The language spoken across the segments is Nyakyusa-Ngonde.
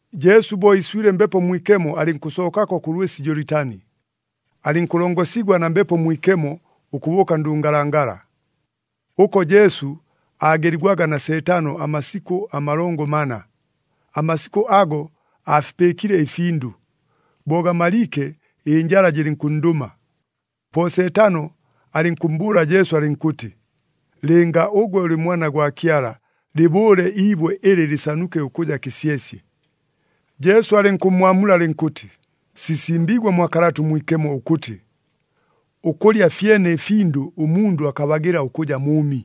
Jesu bo iiswile Mbepo Mwikemo alɨnkʉsookako kʉ lwɨsi Jolitani, alɨnkʉlongosigwa na Mbepo Mwikemo ʉkʉbʉʉka ndʉngalangala. Ʉko Jesu aageligwaga na Seetano amasikʉ amalongo mana. Amasikʉ ago aafipɨɨkile ɨfindʉ. Bo gamaliike ɨnjala jɨlɨnkʉnndʉma. Po Seetano alɨnkʉmmbʉʉla Jesu alɨnkʉtɨ, “Lɨnga ʉgwe ʉlɨ Mwana gwa Kyala, lɨbʉʉle iibwe ɨlɨ lɨsanuke ʉkʉja kɨsyesye.” Jesu alɨnkʉmmwamula alɨnkʉtɨ, “Sisimbiigwe mwa Kalata ʉMwikemo ʉkʉtɨ, ‘Ʉkʉlya fyene ɨfindʉ ʉmundʉ akabagɨla ʉkʉja mʉʉmi.’”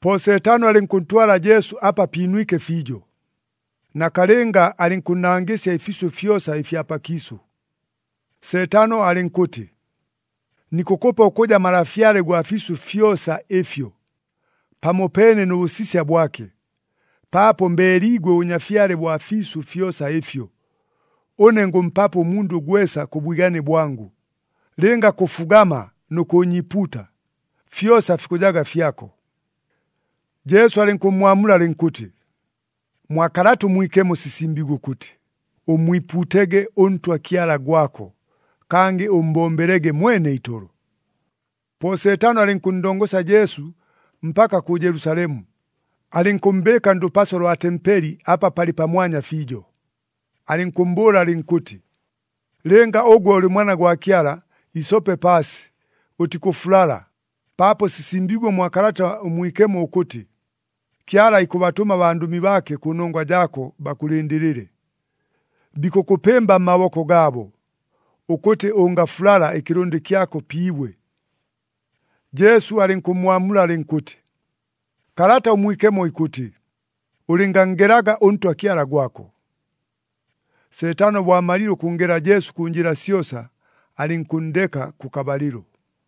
Po Seetano alɨnkʉntwala Jesu apa piinwike fiijo, nakalɨnga alɨnkʉnnangɨsya ɨfiisʉ fyosa ɨfya pakiisʉ. Seetano alɨnkʉtɨ, “Nikʉkʉpa ʉkʉja malafyale gwa fiisʉ fyosa ɨfyo, pamopeene nʉ bʉsisya bwake, paapo mbeeliigwe ʉbʉnyafyale bwa fiisʉ fyosa ɨfyo, ʉne ngʉmpapo ʉmundʉ gwesa kʉ bwigane bwangʉ. Lɨnga kʉfugama nʉ kʉʉnyiipuuta, fyosa fikʉjaga fyako.” Jesu alɨnkʉmmwamula alɨnkʉtɨ, “Mwa Kalata ʉMwikemo sisimbiigwe ʉkʉtɨ, ‘Ʉmmwipuutege ʉNtwa Kyala gwako. Kangɨ ʉmmbombelege mwene itolo.’” Po Seetano alɨnkʉnndongosya Jesu mpaka kʉ Jelusalemu, alɨnkʉmmbɨɨka ndʉpaso lwa tempeli apa palɨ pamwanya fiijo, alɨnkʉmmbʉʉla alɨnkʉtɨ, “Lɨnga ʉgwe ʉlɨ Mwana gwa Kyala, isope paasi. Ʉtikʉfulala, paapo sisimbiigwe mwa Kalata ʉMwikemo ʉkʉtɨ, ‘Kyala ikʉbatʉma abandʉmi baake kʉnongwa jaako, bakʉlɨndɨlɨle. Bikʉkʉpɨmba mmaboko gaabo, ʉkʉtɨ ʉngafulala ɨkɨlʉndɨ kyako pi ibwe.’” Jesu alɨnkʉmmwamula alɨnkʉtɨ, “Kalata ʉMwikemo ikʉtɨ, ‘Ʉlɨnganngelaga ʉNtwa Kyala gwako.’” Seetano bo amalile ʉkʉnngela Jesu kʉ njɨla syosa, alɨnkʉnndeka kʉkabalɨlo.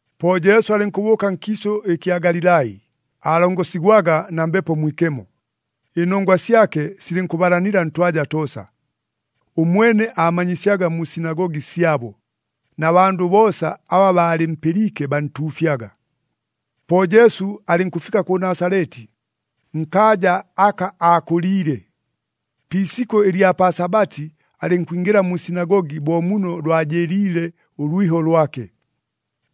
Po Jesu alɨnkʉbʉʉka nkiisʉ ɨkya Galilai, aalongosigwaga na Mbepo Mwikemo. Ɨnongwa syake silɨnkʉbalanila ntwaja toosa. Ʉmwene aamanyisyaga mu sinagogi syabo, na bandʉ boosa aba baalɨmpɨliike bantuufyaga. Po Jesu alɨnkʉfika kʉ Nasaleti, nkaaja aka aakʉliile. Pi isikʉ ɨlya pa Sabati alɨnkwingɨla mu sinagogi bo muno lwajɨɨliile ʉlwiho lwake.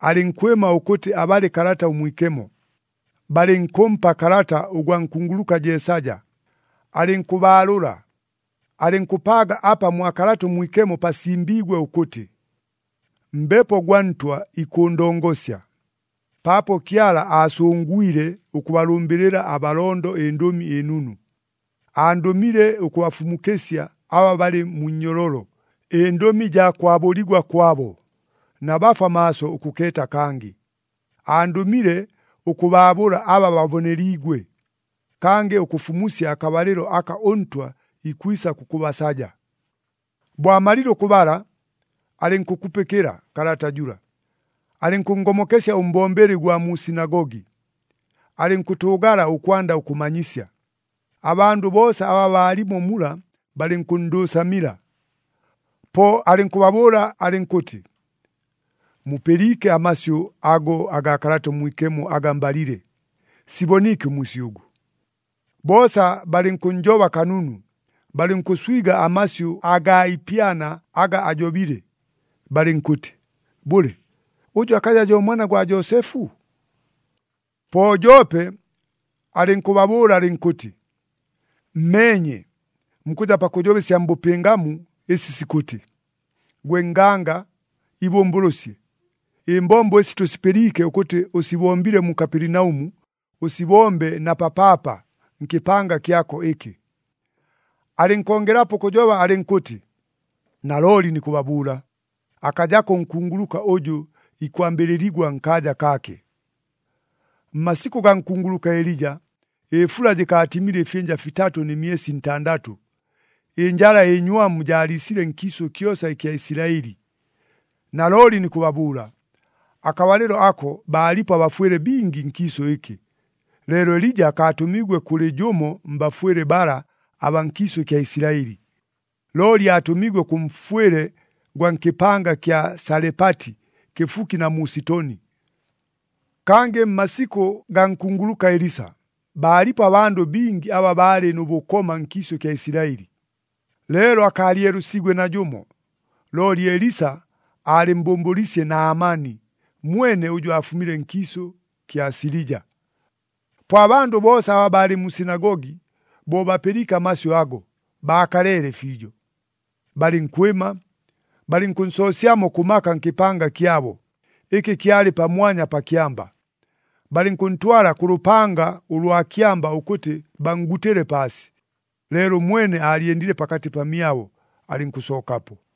Alɨnkwɨma ʉkʉtɨ abale Kalata ʉMwikemo. Balɨnkʉmpa kalata ʉgwa nkunguluka Jeesaja, alɨnkʉbaalʉla, alɨnkʉpaaga apa mwa Kalata ʉMwikemo pasimbiigwe ʉkʉtɨ, “Mbepo gwa Ntwa ikʉʉndongosya, paapo Kyala aasʉngwile ʉkʉbalʉmbɨlɨla abalondo ɨNdʉmi ɨNunu. Andʉmile ʉkʉbafumukɨsya aba balɨ mu nnyololo, ɨndʉmi jaa kwabʉligwa kwabo, na bafwa maaso ʉkʉkeeta kangɨ. Andʉmile ʉkʉbaabʉla aba baboneliigwe, kangɨ ʉkʉfumusya akabalɨlo aka ʉNtwa ikwisa kʉkʉbasaja.” Bo amalile ʉkʉbala, alɨnkʉkupɨkɨla kalata jʉla, alɨnkʉnngomokesya ʉmbombeli ʉgwa mu sinagogi, alɨnkʉtʉʉgala ʉkwanda ʉkʉmanyisya. Abandʉ boosa aba baalimo mula balɨnkʉnndʉʉsamila. Po alɨnkʉbabʉʉla alɨnkʉtɨ, “Mupɨliike amasyʉ ago agaa Kalata ʉMwikemo aga mbalile, siboniike ʉmwisyʉgʉ.” Boosa balɨnkʉnnjoba kanunu, balɨnkʉswiga amasyʉ agaa ipyana aga ajobile, balɨnkʉtɨ, “Bʉle, ʉjʉ akaja jo mwana gwa Joosefu?” Po joope alɨnkʉbabʉʉla alɨnkʉtɨ, “Mmeenye, mukʉja pakʉjoba ɨsya mbʉpɨngamu ɨsi sikʉtɨ, ‘Gwe nganga, ibʉmbʉlʉsye! Ɨmbombo ɨsi tʉsipɨliike ʉkʉtɨ ʉsibombile mu Kapelinaʉmu, ʉsibombe na papaapa nkɨpanga kyako ɨkɨ.’” Alɨnkongelapo ʉkʉjoba alɨnkʉtɨ, “Nalooli nikʉbabʉʉla, akajako ʉnkunguluka ʉjʉ ikwambɨlɨligwa nkaaja kaake. Mmasikʉ gaa nkunguluka Elija, ɨfula jɨkaatimile ɨfyɨnja fitatʉ nɨ myesi ntandatʉ, ɨnjala ɨnywamu jaaliisile nkiisʉ kyosa ɨkya Isilaɨli. Nalooli nikʉbabʉʉla, akabalɨlo ako baalipo abafwɨle bingi nkiisʉ ɨkɨ, leelo Elija akaatʉmiigwe kʉlɨ jʉmo mbafwɨle bala abaa nkiisʉ kya Isilaɨli, looli aatʉmiigwe kʉ mfwɨle gwa nkɨpanga kya Salepati kɨfuki na mu Sitoni. Kangɨ mmasikʉ gaa nkunguluka Elisa, baalipo abandʉ bingi aba baalɨ nʉ bʉkoma nkiisʉ kya Isilaɨli. Leelo akaalyelʉsiigwe najʉmo, looli Elisa aalɨmmbʉmbʉlwisye Naamani mwene ʉjʉ aafumile nkiisʉ kya Silija!” Po abandʉ boosa aba baalɨ mu sinagogi, bo bapɨliike amasyʉ ago, baakaleele fiijo. Balɨnkwɨma, balɨnkʉnsoosyamo kʉ maka nkɨpanga kyabo, ɨkɨ kyalɨ pamwanya pa kyamba. Balɨnkʉntwala kʉ lʉpanga ʉlwa kyamba ʉkʉtɨ banngutɨle paasi. Leelo ʉmwene aalyendile pakatɨ pamyabo, alɨnkʉsookapo.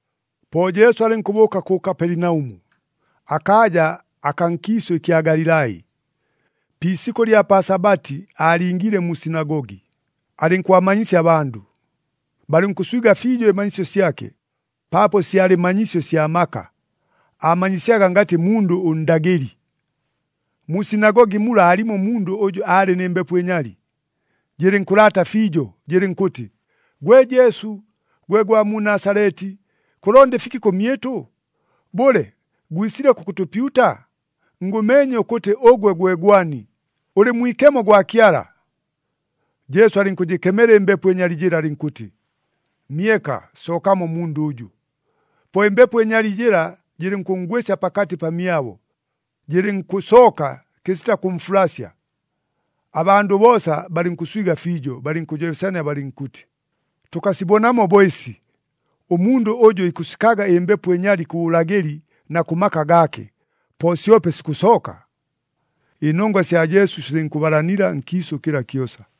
Po Jesu alɨnkʉbʉʉka kʉ Kapelinaʉmu, akaaja akaa nkiisʉ ɨkya Galilai. Pi isikʉ ɨlya pa Sabati aalingiile mu sinagogi, alɨnkʉbamanyisya abandʉ. Balɨnkʉswiga fiijo ɨmanyisyo syake, paapo syalɨ manyisyo sya maka, aamanyisyaga ngatɨ mundʉ ʉndagɨli. Mu sinagogi mula aalimo ʉmundʉ ʉjʉ aalɨ nɨ mbepo ɨnyali, jɨlɨnkʉlaata fiijo, jɨlɨnkʉtɨ, “Gwe Jesu, gwe gwa mu Nasaleti, kʉlonda ɨfiki kʉmyɨtʉ? Bʉle, gwisile kʉkʉtʉpyuta? Ngʉmeenye ʉkʉtɨ ʉgwe gwe gwani. Ʉlɨ Mwikemo gwa Kyala!” Jesu alɨnkʉjɨkemela ɨmbepo ɨnyali jɨla alɨnkʉtɨ, “Myeka! Sookamo mmundʉ ʉjʉ!” Po ɨmbepo ɨnyali jɨla jɨlɨnkʉnngwɨsya pakatɨ pamyabo, jɨlɨnkʉsooka kɨsita kʉmfulasya. Abandʉ boosa balɨnkʉswiga fiijo, balɨnkʉjobesania balɨnkʉtɨ, “Tʉkasibonamo bo ɨsi! Ʉmundʉ ʉjʉ ikʉsikaga ɨmbepo ɨnyali kʉ bʉlagɨli na kʉ maka gaake, po syope sikʉsooka!” Ɨnongwa sya Jesu silɨnkʉbalanila nkiisʉ kɨla kyosa.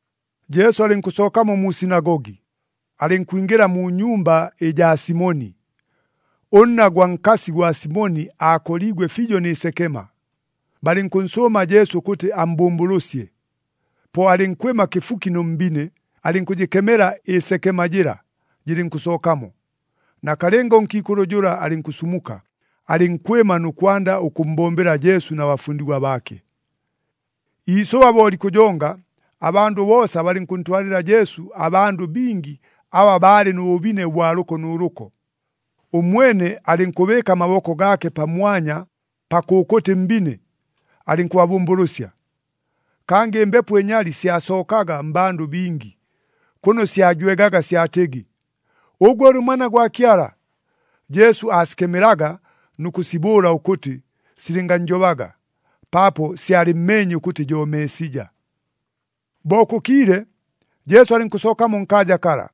Jesu alɨnkʉsookamo mu sinagogi, alɨnkwingɨla mu nyumba ɨjaa Simoni. Ʉnna gwa nkasi gwa Simoni aakoliigwe fiijo nɨ sekema, balɨnkʉnsʉʉma Jesu ʉkʉtɨ ammbʉmbʉlʉsye. Po alɨnkwɨma kɨfuki nʉ mbine, alɨnkʉjɨkemela ɨsekema jɨla, jɨlɨnkʉsookamo. Nakalɨnga ʉnkiikʉlʉ jʉla alɨnkʉsumuka, alɨnkwɨma nʉ kwanda ʉkʉmmbombela Jesu na bafundigwa baake. Iisʉba bo likʉjonga, abandʉ boosa balɨnkʉntwalɨla Jesu abandʉ bingi aba baalɨ nʉ bʉbine ʉbwa lʉko nʉ lʉko. Ʉmwene alɨnkʉbɨɨka amaboko gaake pamwanya pa kʉkʉtɨ mbine, alɨnkʉbabʉmbʉlʉsya. Kangɨ ɨmbepo ɨnyali syasookaga mmbandʉ bingi, kʉno syajwegaga syatɨgɨ, “Ʉgwe ʉlɨ Mwana gwa Kyala!” Jesu aasikemelaga nʉ kʉsibʉʉla ʉkʉtɨ silɨngajobaga, paapo syalɨmmeenye ʉkʉtɨ jo Meesija. Bo kʉkiile, Jesu alɨnkʉsookamo nkaaja kala,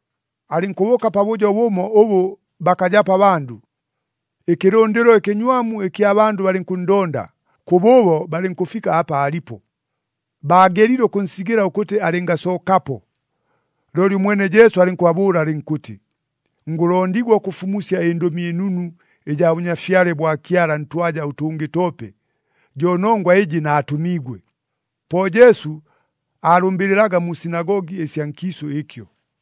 alɨnkʉbʉʉka pabʉjo bʉmo ʉbʉ bakajapo abandʉ. Ɨkɨlʉndɨlo ɨkɨnywamu ɨkya bandʉ balɨnkʉnndonda, kʉbʉʉbo balɨnkʉfika apa aalipo. Baagelile ʉkʉnsigɨla ʉkʉtɨ alɨngasookapo. Looli ʉmwene Jesu alɨnkʉbabʉʉla alɨnkʉtɨ, “Ngʉlondigwa ʉkʉfumusya ɨNdʉmi ɨNunu ɨjaa Bʉnyafyale bwa Kyala ntwaja ʉtʉngɨ toope. Jo nongwa ɨjɨ naatʉmiigwe.” Po Jesu aalʉmbɨlɨlaga mu sinagogi ɨsya nkiisʉ ɨkyo.